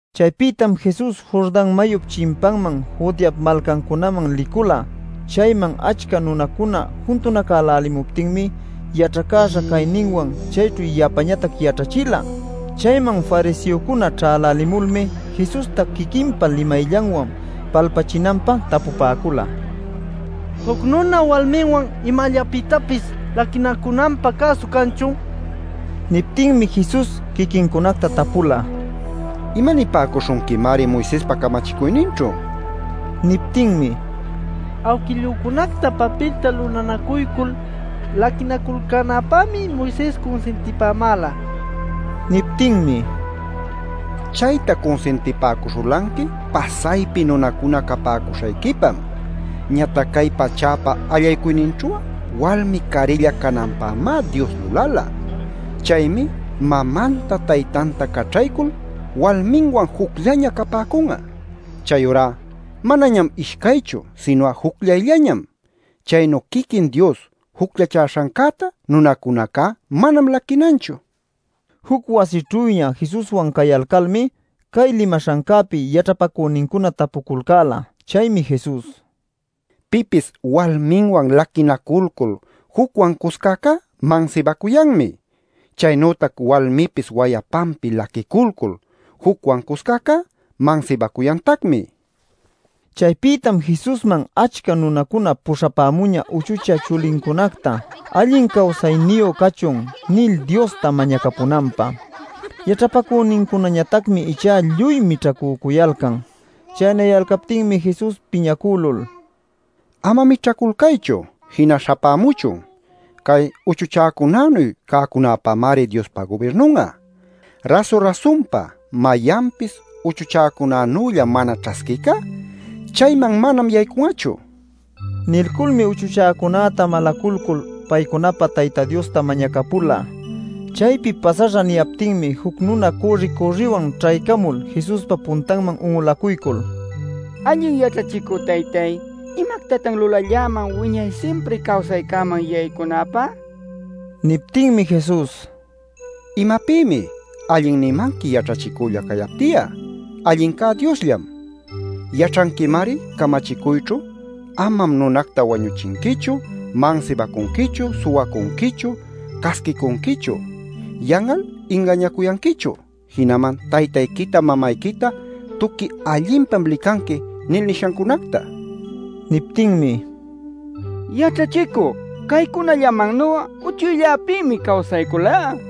Chaypïtam Jesus Jordan mayup chimpanman, Judeap malcancunaman licula. Chayman achca nunacuna juntunacälälimuptinmi yaćhacäśha cayninwan chayćhu yapañatac yaćhachila. Chayman fariseocuna ćhälälimulmi Jesusta quiquinpa limayllanwan palpachinanpä tapupäcula: “¿Juc nuna walminwan imallapïtapis laquinacunanpä cäsu canchun?” nil. Niptinmi Jesus quiquincunacta tapula: “¿Imanipäcuśhunquimari Moisespa camachicuyninćhu?” nil. Niptinmi: “Awquillücunactá papilta lulanacuycul laquinaculcänapämi Moises cunsintipämäla” nila. Niptinmi: “Chayta cunsintipäcuśhulanqui pasaypi nunacuna capäcuśhayquipam. Ñatac cay pachäpa allaycuyninćhu'a walmi carilla cananpämá Dios lulala. Chaymi mamanta, taytanta caćhaycul walminwan jucllaña capäcun'a. Chayurá manañam ishcaychu sinu'a jucllayllañam. Chaynu quiquin Dios jucllachäśhancäta nunacunacá manam laquinanchu” nin. Juc wasićhüña Jesuswan cayalcalmi cay limaśhancäpi yaćhapacünincuna tapuculcäla. Chaymi Jesus: “Pipis walminwan laquinaculcul jucwan cuscäcá, mansibacuyanmi. Chaynütac walmipis wayapanpi laquiculcul jucwan cuscäcá, mansibacuyantacmi” nin. Chaypïtam Jesusman achca nunacuna puśhapämuñä uchuchä chulincunacta “Allin cawsayniyu cachun” nil Diosta mañacapunanpä. Yaćhapacünincunañatacmi ichá lluy mićhacücuyalcan. Chaynayalcaptinmi Jesus piñacülul: “Ama mićhaculcaychu; jina śhapämuchun. Cay uchuchäcunanuy cäcunapämari Diospa gubirnun'a. Rasu-rasunpa, mayanpis uchuchäcunanülla mana ćhasquïcá, chayman manam yaycun'achu” nin. Nilculmi uchuchäcunäta malaculcul, paycunapä Tayta Diosta mañacapula. Chaypi pasaśhä niyaptinmi juc nuna cürri-cürriwan ćhaycamul Jesuspa puntanman un'ulacuycul: “Allin yaćhachicü Taytay, ¿imactatan lulalläman wiñay simpri cawsaycäman yaycunäpä?” nin. Niptinmi Jesus: “¿Imapïmi ‘allin’ nimanqui yaćhachicülla cayapti'a? Allincá Diosllam” nin. Nilculmi: “Yaćhanquimari camachicuyćhu: ‘Amam nunacta wañuchinquichu; mansibacunquichu; suwacunquichu; casquicunquichu; yan'al ingañacuyanquichu; jinaman taytayquita mamayquita tuqui allinpam licanqui’ nil nishancunacta” nin. Niptinmi: “Yaćhachicü, caycunallamannu'a uchucllapïmi cawsayculá” nin.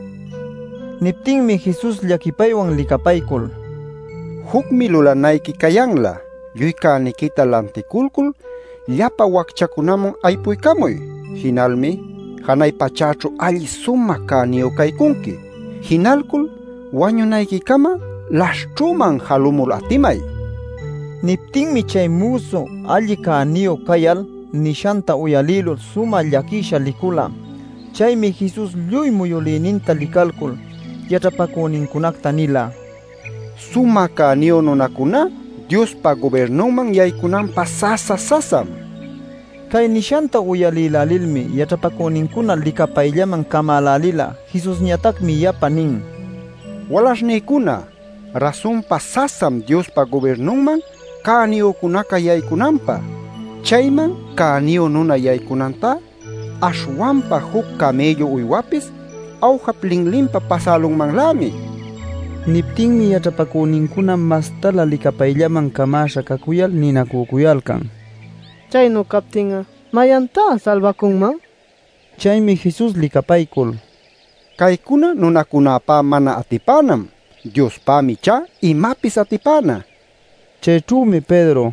Niptinmi Jesus llaquipaywan licapaycul: “Jucmi lulanayqui cayanlä: lluy cäniquita lanticulcul llapa wacchacunaman aypuycamuy. Jinalmi janay pachäćhu alli sumä cäniyu caycunqui. Jinalcul wañunayquicama laśhćhüman jalumul atimay” nila. Niptinmi chay müsu alli cäniyu cayal nishanta uyalïlul sumä llaquisha licula. Chaymi Jesus lluy muyülïninta licalcul yaćhapacünincunacta nila: “Sumä cäniyu nunacuná Diospa gubirnunman yaycunanpä, sasa-sasam” nil. Cay nishanta uyalïlälilmi yaćhapacünincuna licapayllaman camälälila. Jesusñatacmi yapa nin: “Walaśhnïcuna, rasunpa sasam Diospa gubirnunman cäniyücunaca yaycunanpä. Chayman cäniyu nuna yaycunantá aśhwanpa juc camïllu uywapis awjap linlinpa pasälunmanlämi” nil. Niptinmi yaćhapacünincuna mastalä licapayllaman camäśha cacuyal ninacücuyalcan: “Chaynu captin'a ¿mayantá salbacunman?” nil. Chaymi Jesus licapaycul: “Caycuna nunacunapá mana atipänam. Diospämi ichá imapis atipäna” nin. Chayćhümi Pedro: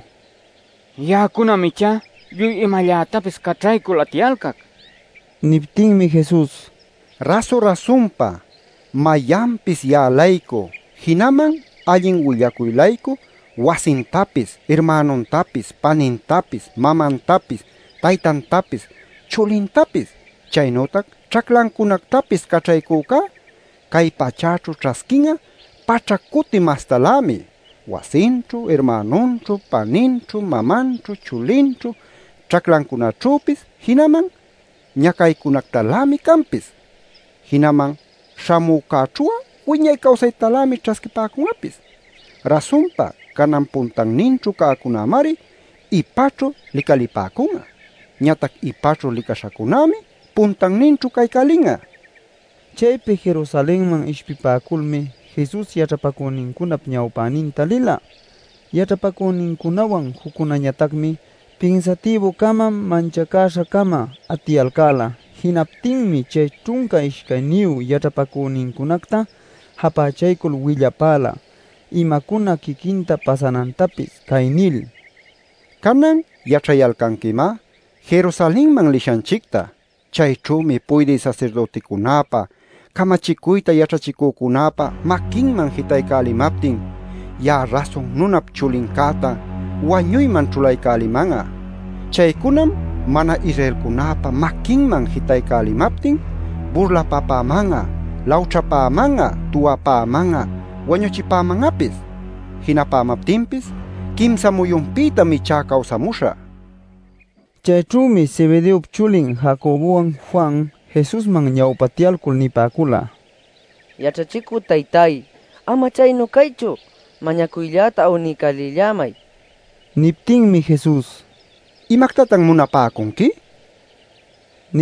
“Ya'acunam ichá lluy imallätapis caćhaycul atiyalcac” nicuyan. Niptinmi Jesus: “Rasu-rasunpa, mayanpis ya'a-laycu, jinaman allin willacuy-laycu, wasintapis, irmänuntapis, panintapis, mamantapis, taytantapis, chulintapis, chaynütac ćhaclancunactapis caćhaycücá cay pachäćhu ćhasquin'a paćhac cuti mastalämi, wasinćhu, irmänunćhu, paninćhu, mamanćhu, chulinćhu ćhaclacunaćhüpis, jinaman ñacaycunactalämi canpis. Jinaman śhamücäćhu'a wiñay cawsaytalämi ćhasquipäcun'apis. Rasunpa canan puntanninćhu cäcunämari ipaćhu licalipäcun'a; ñatac ipaćhu licaśhacunämi puntanninćhu caycälin'a” nila. Chaypi Jerusalenman ishpipäculmi Jesus yaćhapacünincunap ñawpäninta lila. Yaćhapacünincunawan juccunäñatacmi pinsatïbu-cama manchacäśha-cama atiyalcäla. Jinaptinmi chay ćhunca ishcayniyu yaćhapacünincunacta japächalcul willapäla imacuna quiquinta pasanantapis cay nil: “Canan yaćhayalcanquimá Jerusalenman lishanchicta. Chayćhümi puydï sasirdüticunäpa, camachicuyta yaćhachicücunäpa maquinman jitaycälimaptin, ya'a Rasun Nunap Chulincäta wañuyman ćhulaycäliman'a. Chaycunam mana-Israelcunäpa maquinman jitaycälimaptin burlapapäman'a, lawćhapäman'a, tuwapäman'a, wañuchipäman'apis. Jinapämaptinpis quimsa muyunpïtam ichá cawsamuśhä” nin. Chayćhümi Zebedeop chulin Jacobowan Juan, Jesusman ñawpatyalcul nipäcula: “Yaćhachicü taytay, ama chaynu caychu, mañacuylläta awniycälillämay” nil. Niptinmi Jesus: “¿Imactatan munapäcunqui?” nin.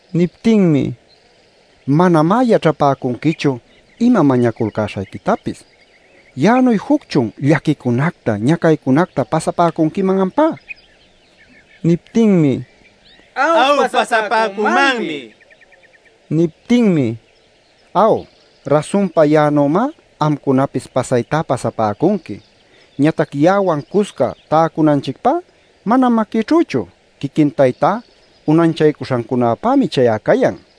Niptinmi: “Manamá yaćhapäcunquichu ima mañaculcäśhayquitapis. ¿Ya'anuy jucchun llaquicunacta ñacaycunacta pasapäcunquiman ampá?” nin. Niptinmi: “Aw, pasapäcümanmi” nipäcula. Niptinmi: “Aw, rasunpa ya'anümá amcunapis pasaytá pasapäcunqui. Ñatac ya'awan cusca täcunanchicpá manam maquïćhüchu. Quiquin Taytá unanchacuśhancunapämi chay'a cayan” nin.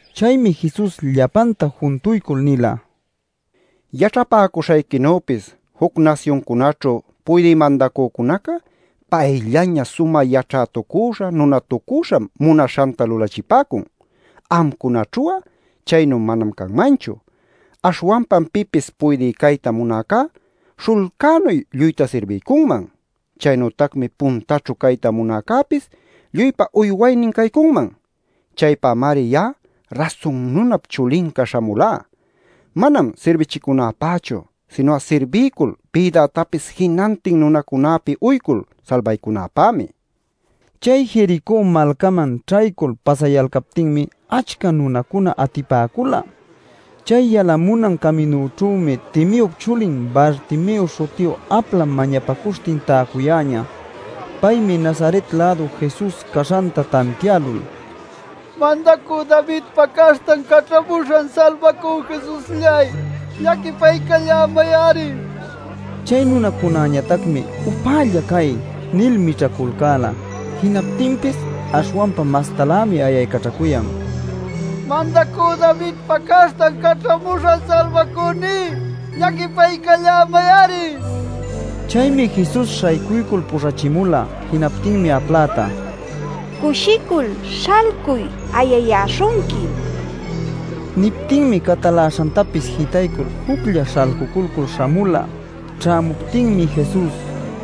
Chaymi Jesus llapanta juntuycul nila: “Yaćhapäcuśhayquinüpis juc nasyuncunaćhu puydï mandacücunaca payllaña sumä yaćhätucüśha nunatucüśham munaśhanta lulachipäcun. Amcunaćhu'a chaynu manam canmanchu. Aśhwanpam pipis puydï cayta munäcá śhullcänuy lluyta sirbiycunman. Chaynütacmi puntaćhu cayta munäcäpis lluypa uywaynin caycunman. Chaypämari ya'a Rasun Nunap Chulinca śhamulá: manam sirbichicunäpächu, sinu'a sirbiycul bïdätapis jinantin nunacunäpi uycul salbaycunäpämi” nin. Chay Jericó malcaman ćhaycul pasayalcaptinmi achca nunacunaca atipäcula. Chay yalamunan caminućhümi Timeop chulin Bartimeo śhutiyu apla mañapacuśhtin täcuyäñä. Paymi Nazaret-lädu Jesus caśhanta tantiälul: “¡Mandacü Davidpa Caśhtan Caćhamuśhan Salbacü, Jesuslláy! ¡Llaquipaycallämay-ari!” nil ayaycaćhacuyan. Chay nunacunäñatacmi: “¡Upällalla cay!” nil mićhaculcäla. Jinaptinpis aśhwanpa mastalämi ayaycaćhacuyan “¡Mandacü Davidpa Caśhtan Caćhamuśhan Salbacüní! ¡Llaquipaycallämay-ari!” nil. Chaymi Jesus śhaycuycul puśhachimula. Jinaptinmi apläta: “¡Cushicul śhalcuy! Ayayäśhunquim” nipäcula. Niptinmi cataläśhantapis jitaycul juclla śhalcuculcul śhamula. Ćhämuptinmi Jesus: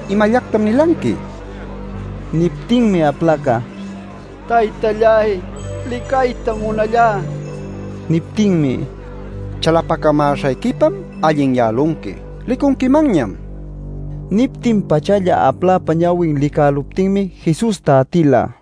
“¿Imallactam nilanqui?” nin. Niptinmi aplaca: “Taytalláy, licaytam munallá” nin. Niptinmi: “Chalapacamäśhayquipam allinyälunqui; licunquimanñam” nin. Niptin-pachalla apläpa ñawin licäluptinmi Jesusta atila.